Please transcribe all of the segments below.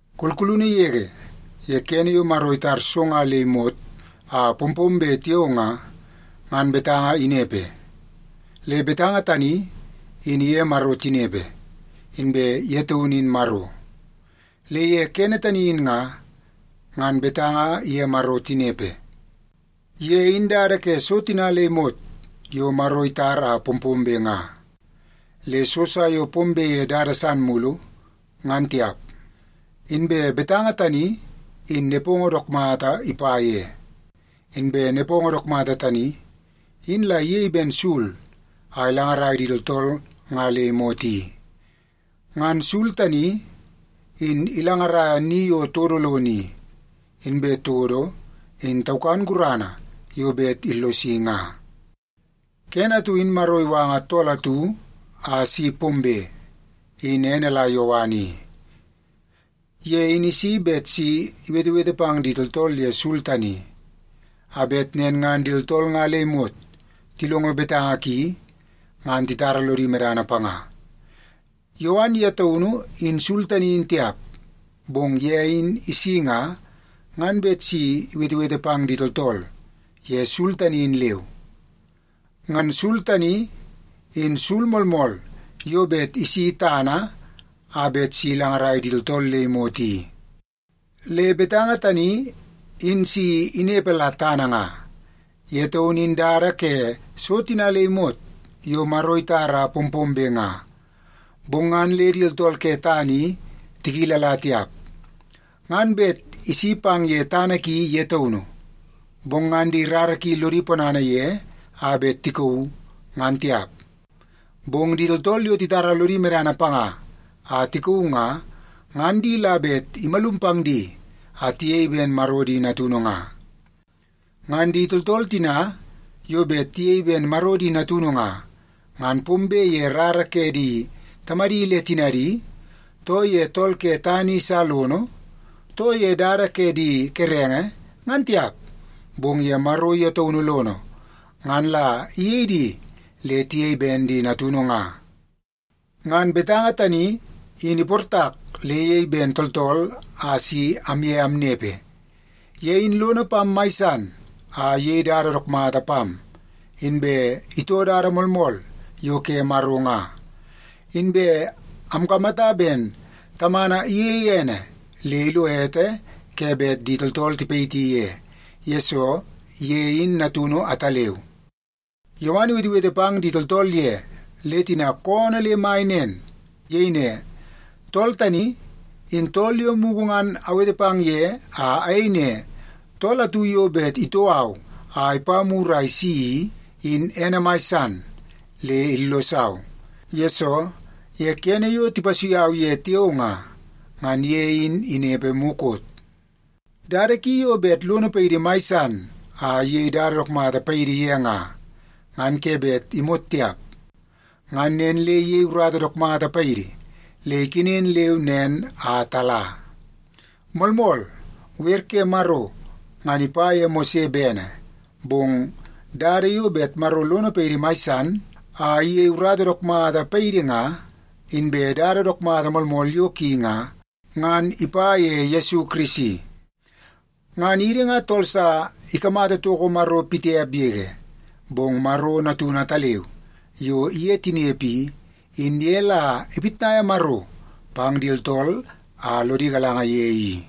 Kulkulunu yege, ye kene yo Maro itar so nga le imot a pompombe tiao nga, ngan Betanga inepe. Le Betanga tani in iye Maro tinepe, inbe ye taunu in Maro. Le ye kene tani in nga, ngan Betanga iye Maro tinepe. Ye in la dada ke so tina le imot yo Maro itar a pompombe nga. Le so sa yo pombe ye dada san mulu, ngan tiap. Inbe Betanga tani in nepongo dook mata ipa ye. Inbe nepongo dook mata tani, in la iyei ben sul a ilangarai di tooltool nga le imot i. Ngan sul tani, in ilangaraia ni yo todo lono i, inbe todo in taukan gurana yo bet illosi nga. Kene atu in Maro iwanga tool atu a si pombe, in ene la Yowan i. Ye in isi bet si iwetewete pang di tooltool ye sul tani, a bet nen ngan di tooltool nga le imot tilongo betanga ki ngan titara lodi medana panga. Yowan ye taunu in sul tani in tiap. Bong ye in isi nga, ngan bet si iwetewete pang di tooltool ye sul tani in leu. Ngan sul tani, in sul moolmool yo bet isi tana a bet si ilangarai di tooltool le imot i. Le Betanga tani in si inepe la tana nga. Ye taun in dada ke so tina le imot yo Maro itar a pompombe nga, bong ngan le di tooltool ke tana i tikilala tiap. Ngan bet isi pang ye tana ki ye taunu, bong ngan di rara ki lodi ponana ye a bet tikauu, ngan tiap. Bong di tooltool yo titara lodi medana panga a tikauu nga, ngan di la bet imalum pang di a tiyei ben Maro di natunu nga. Ngan di tooltool tina yo bet tiyei ben Maro di natunu nga, ngan pombe ye rara ke di tamadi le tinadi, too ye tool ke tana i sa lono, too ye dada ke di kerenge, ngan tiap, bong ye Maro ye taunu lono ngan la iyei di le tiyei ben di natunu nga. Ngan Betanga tani in iportak le iyei ben tooltool a si amye amnepe. Ye in lono pam mai san a iyei dada dook mata pam, inbe itoo dada moolmool yo ke Maro nga. Inbe amkamata ben Tamana iyeie ene le ilo ete ke bet di tooltool tipayiti ye, yesoo ye in Natunu ataleu. Yowan iwetewete pang di tooltool ye, le tina koonoo le mai nen. Iyei ne, “Tool tani, in tool yo mugu ngan awete pang ye a ayei ne, ‘Tool atu yo bet itoo au a ipa mur a isi i, in ene mai san le illosau, yesoo ye kene yo tipasui au ye tiao nga, ngan ye in inepe mukot.’” Dada ki yo bet lono paidi mai san a iyei dada dook mata paidi ye nga, ngan ke bet imot tiap. Ngan nen le iyei urata dook mata paidi le ikenen leu nen a tala. Moolmool, wer ke Maro ngan ipa ye Mose bene, bong dada yo bet Maro lono paidi mai san a iyei urata dook mata paidi nga, inbe dada dook mata moolmool yo ki nga, ngan ipa ye Yesu Kirisi. Ngan idi nga tool sa ikamata toko Maro pitiap yege. Bong Maro Natunu ataleu yo iye tinepe i, in ye la ipitnaia Maro pang di tooltool a lodi galanga ye i.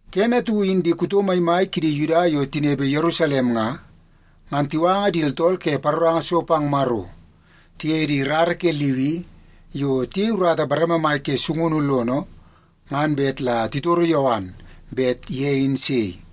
Kene atu in di kuto maimai kidi Yuda yo tinepe Yerusalem nga, ngan tiwanga di tooltool ke paroranga so pang Maro, tiye di rara ke Liwi yo tiyei urata bareme mai ke sungunu lono ngan bet la titoro Yowan bet ye in sei.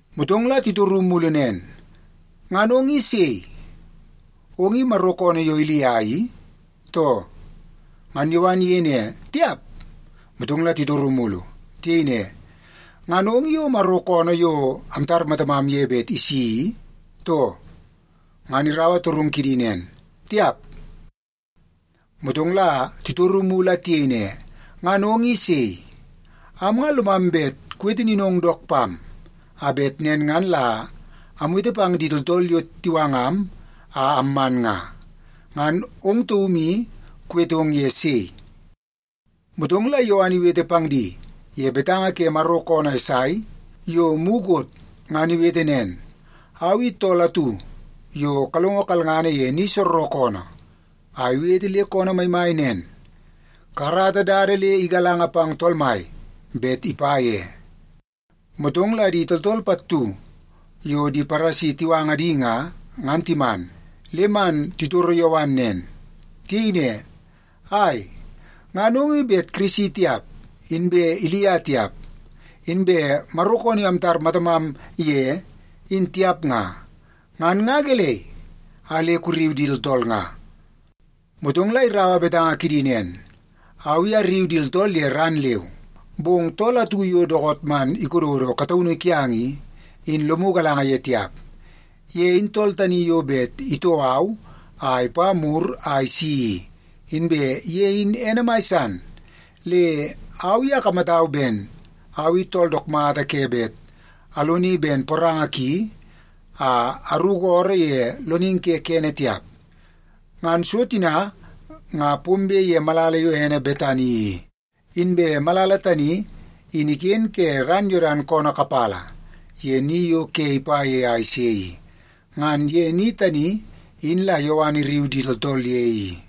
Motong la titoru mulu nen, “Ngan ong i sei? Ong i Maro koonoo yo Ilia i, too?” Ngan Yowan iyei ne, “Tiap.” Motong la titoru mulu. Tiyei ne, “Ngan ong i o Maro koonoo yo amtar matamam ye bet isi i, too?” Ngan iraua torungu kidi nen, “Tiap.” Motong la titoru mulu a tiyei ne, “Ngan ong i sei? Am nga lomam bet kuwete ninong dook pam, a bet nen ngan la amwete pang di tooltool yo tiwangam a amman nga. Ngan ong taum i kuwetong ye sei?” Motong la Yowan iwete pang di ye betanga ke Maro koonoo Esai yo mukot ngan iwete nen, “Au i tool atu yo kalongo kalngana ye ni soorookoonoo a iwete le koonoo maimai nen, ‘Kakarata dada le igalanga pang Tool Mai bet ipa ye.’” Motong la di tooltool pattu yo di Paresi tiwanga di nga, ngan timan le man titoro Yowan nen. Tiyei ne, “Ai, ngan ong i bet Kirisi tiap, inbe Ilia tiap, inbe Maro koonoo yo amtar matamam ye, in tiap nga, ngan nga gelei a le kurriu di tooltool nga?” Motong la iraua betanga kidi nen, “Au i arriu di tooltool ye ran leu, bong tool atu yo dookoot man ikododo kataunu kiang i, in lomu galanga ye tiap. Ye in tool tani yo bet itoo au a ipa mur a isi i. Inbe ye in ene mai san, le au i akamatau ben au i tool dook mata ke bet aloni ben poranga ki a aruku ooroo ye loningi ke kene tiap.” Ngan so tina nga pombe ye malala yo ene Betani i, inbe malala tani in iken ke ran Yodan koonoo kapala ye ni yo ke ipa ye a ise i. Ngan ye ni tani in la Yowan irriu di tooltool ye i.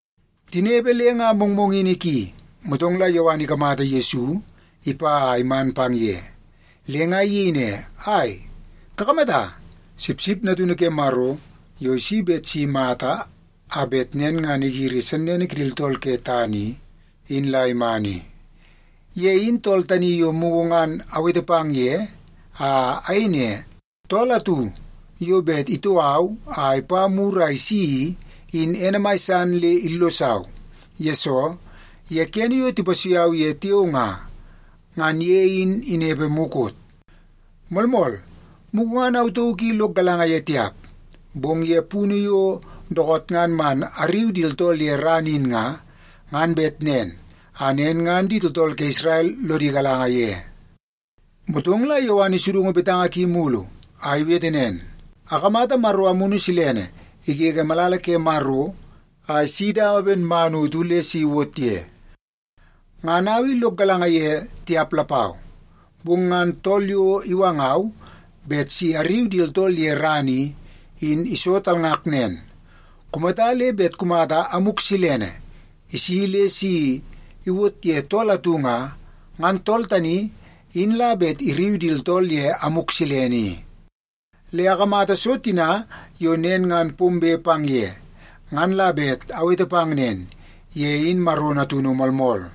Tinepe le nga mongmongini ki, motong la Yowan ikamata Yesu ipa a iman pang ye, le nga iyei ne, “Ai, kakamata! Sipsip Natunu Ke Maro yo isi bet si imata a bet nen ngan igiri sennene kidi tooltool ke tana i, in la iman i! Ye in tool tani yo mugu ngan awete pang ye, a ayei ne, ‘Tool atu yo bet itoo au a ipa mur a isi i, in ene mai san le illosau, yesoo ye kene yo tipasui au ye tiao nga, ngan ye in inepe mukot.’ Moolmool, mugu ngan au tauk i lok galanga ye tiap. Bong ye punu yo dookoot ngan man arriu di tooltool ye ran in nga, ngan bet nen a nen ngan di tooltool ke Isrel lodi galanga ye.” Motong la Yowan isudungu betanga ki mulu a iwete nen, “Akamata Maro Amunu Silene igege malala ke Maro a isi dawa ben man utu le si iwot ye. Ngan au i lok galanga ye tiap lapau, bong ngan tool yo iwangau bet si arriu di tooltool ye ran i, in iso talngak nen, ‘Kumata le bet kumata Amuk Silene isi le si iwot ye tool atu nga, ngan tool tani in la bet irriu di tooltool ye Amuk Silene i.’ Le akamata so tina yo nen ngan pombe pang ye, ngan la bet awete pang nen: Ye in Maro Natunu moolmool.”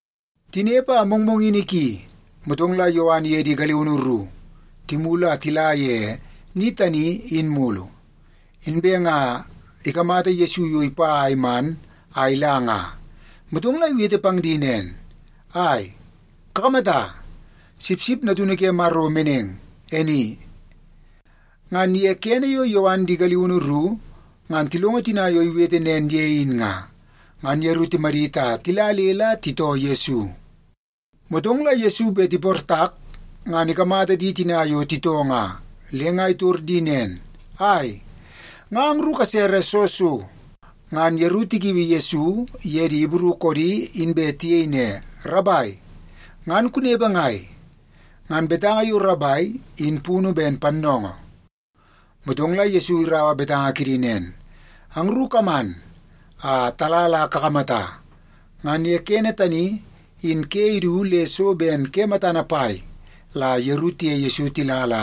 Tinepe a mongmongini ki, motong la Yowan iye di galiunu ru timulu a tila ye ni tani in mulu. Inbe nga ikamata Yesu yo ipa a iman a ila nga, motong la iwete pang di nen, “Ai, kakamata! Sipsip Natunu ke Maro meneng, e ni!” Ngan ye kene yo Yowan di galiunu ru ngan tilongo tina yo iwete nen ye in nga, ngan yeru timadit a tila le la titoo Yesu. Motong la Yesu bet iportak ngan ikamata di tina yo titoo nga, le nga itor di nen, “Ai, nga angru kasere soo so?” Ngan yeru tikiui Yesu ye di Ibru koodi inbe tiyei ne, “Rabai, ngan kunepe ngai?” (Ngan betanga yo “Rabai” in punu ben “Pannoongoo.”) Motong la Yesu iraua betanga kidi nen, “Angru kaman a tala la kakamata.” Ngan ye kene tani in ke idu le so ben ke matana pai la yeru tiye Yesu tila la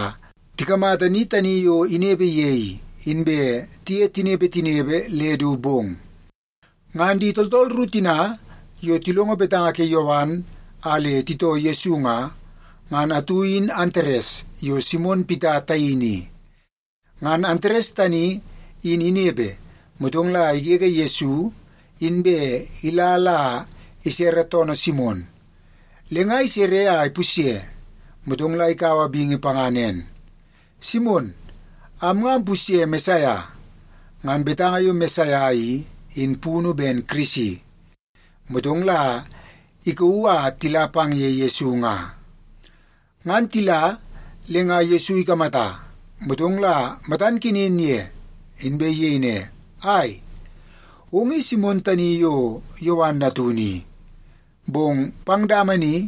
tikamata ni tani yo inepe ye i, inbe tiye tinepe tinepe le du bong. Ngan di tooltool ru tina yo tilongo betanga ke Yowan a le titoo Yesu nga, ngan atu in Antares yo Simon Pita taini i. Ngan Antares tani in inepe, motong la igege Yesu inbe ila la isere toonoo Simon. Le nga isere a ipusye, motong la ikaua bingi panga nen, “Simon, am nga ampusye Mesaia.” (Ngan betanga yo “Mesaia” i, in punu ben “Kirisi.”) Motong la ikauu a tila pang ye Yesu nga. Ngan tila, le nga Yesu ikamata, motong la matan kenen ye, inbe iyei ne, “Ai, ong i Simon tani yo Yowan natunu i. Bong pang dama ni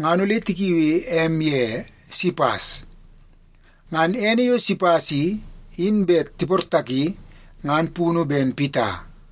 ngan ole tikiui em ye Sipas.” (Ngan ene yo Sipas i, in bet tiportaki ngan punu ben Pita).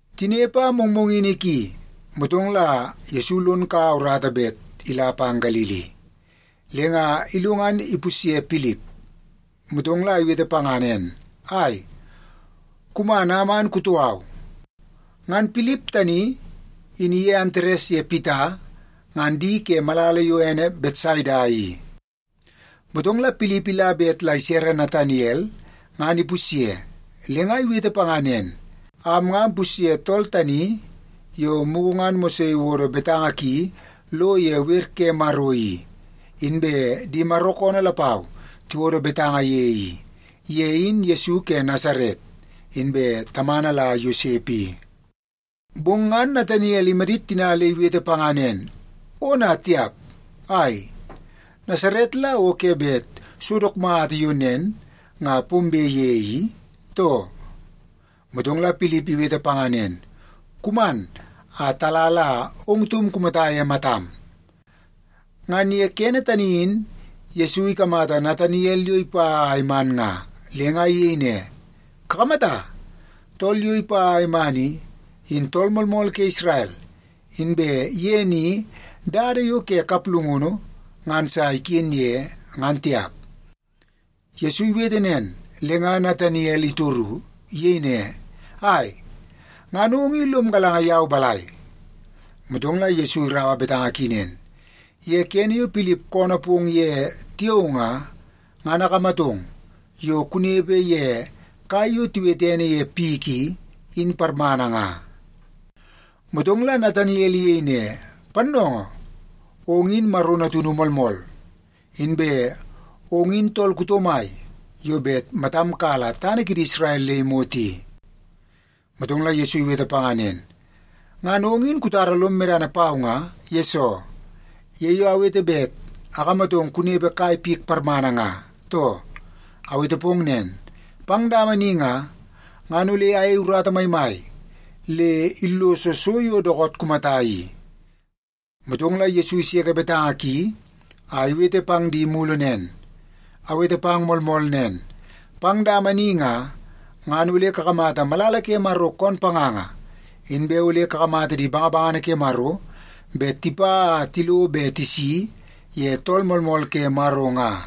Tinepe a mongmongini ki, motong la Yesu lon kau urata bet ila pang Galili. Le nga ilo ngan ipusye Pilip, motong la iwete panga nen, “Ai, kuman a man kutoo au.” Ngan Pilip tani in iye Antares ye Pita ngan di ke malala yo ene Betsaida i. Motong la Pilip ila bet la isere Nataniel ngan ipusye, le nga iwete panga nen, “Am nga ampusye tool tani yo mugu ngan Mose iwodo betanga ki lo ye Wer ke Maro i, inbe di Maro koonoo lapau tiwodo betanga ye i. Ye in Yesu ke Nasaret, inbe tamana la Yosep i.” Bong ngan Nataniel imadit tina le iwete panga nen, “Ona tiap! Ai, Nasaret la o ke bet so dook mata yo nen nga pombe ye i, too?” Motong la Pilip iwete panga nen, “Kuman a tala la ong taum kumata ye matam.” Ngan ye kene tani in Yesu ikamata Nataniel yo ipa a iman nga, le nga iyei ne, “Kakamata, tool yo ipa a iman i, in tool moolmool ke Isrel. Inbe ye ni dada yo ke kaplungunu ngan sa iken ye, ngan tiap.” Yesu iwete nen, le nga Nataniel itoru. Iyei ne, “Ai, ngan ong i lom galanga yau balai?” Motong la Yesu iraua betanga ki nen, “Ye kene yo Pilip koonoo pong ye tiao nga, ngan akamatong yo kunepe ye kai yo tiwete ene ye pik i, in parmana nga.” Motong la Nataniel iyei ne, “Pannoongoo, ong in Maro Natunu moolmool! Inbe ong in tool kuto mai yo bet matam kala tana kidi Isrel le imot i!” Motong la Yesu iwete panga nen, “Ngan ong in kutara lom medana pau nga, yesoo ye yo awete bet akamatong kunepe kai pik parmana nga, too? Awete pong nen, pang dama ni nga, ngan ole ayei urata maimai le illoso so yo dookoot kumata i.” Motong la Yesu iseke betanga ki a iwete pang di mulu nen, “Awete pang moolmool nen, pang dama ni nga, ngan ole kakamata malala ke Maro koon panganga, inbe ole kakamata di bangabangana ke Maro bet tipa a tilo be tisi ye Tool Moolmool ke Maro nga.”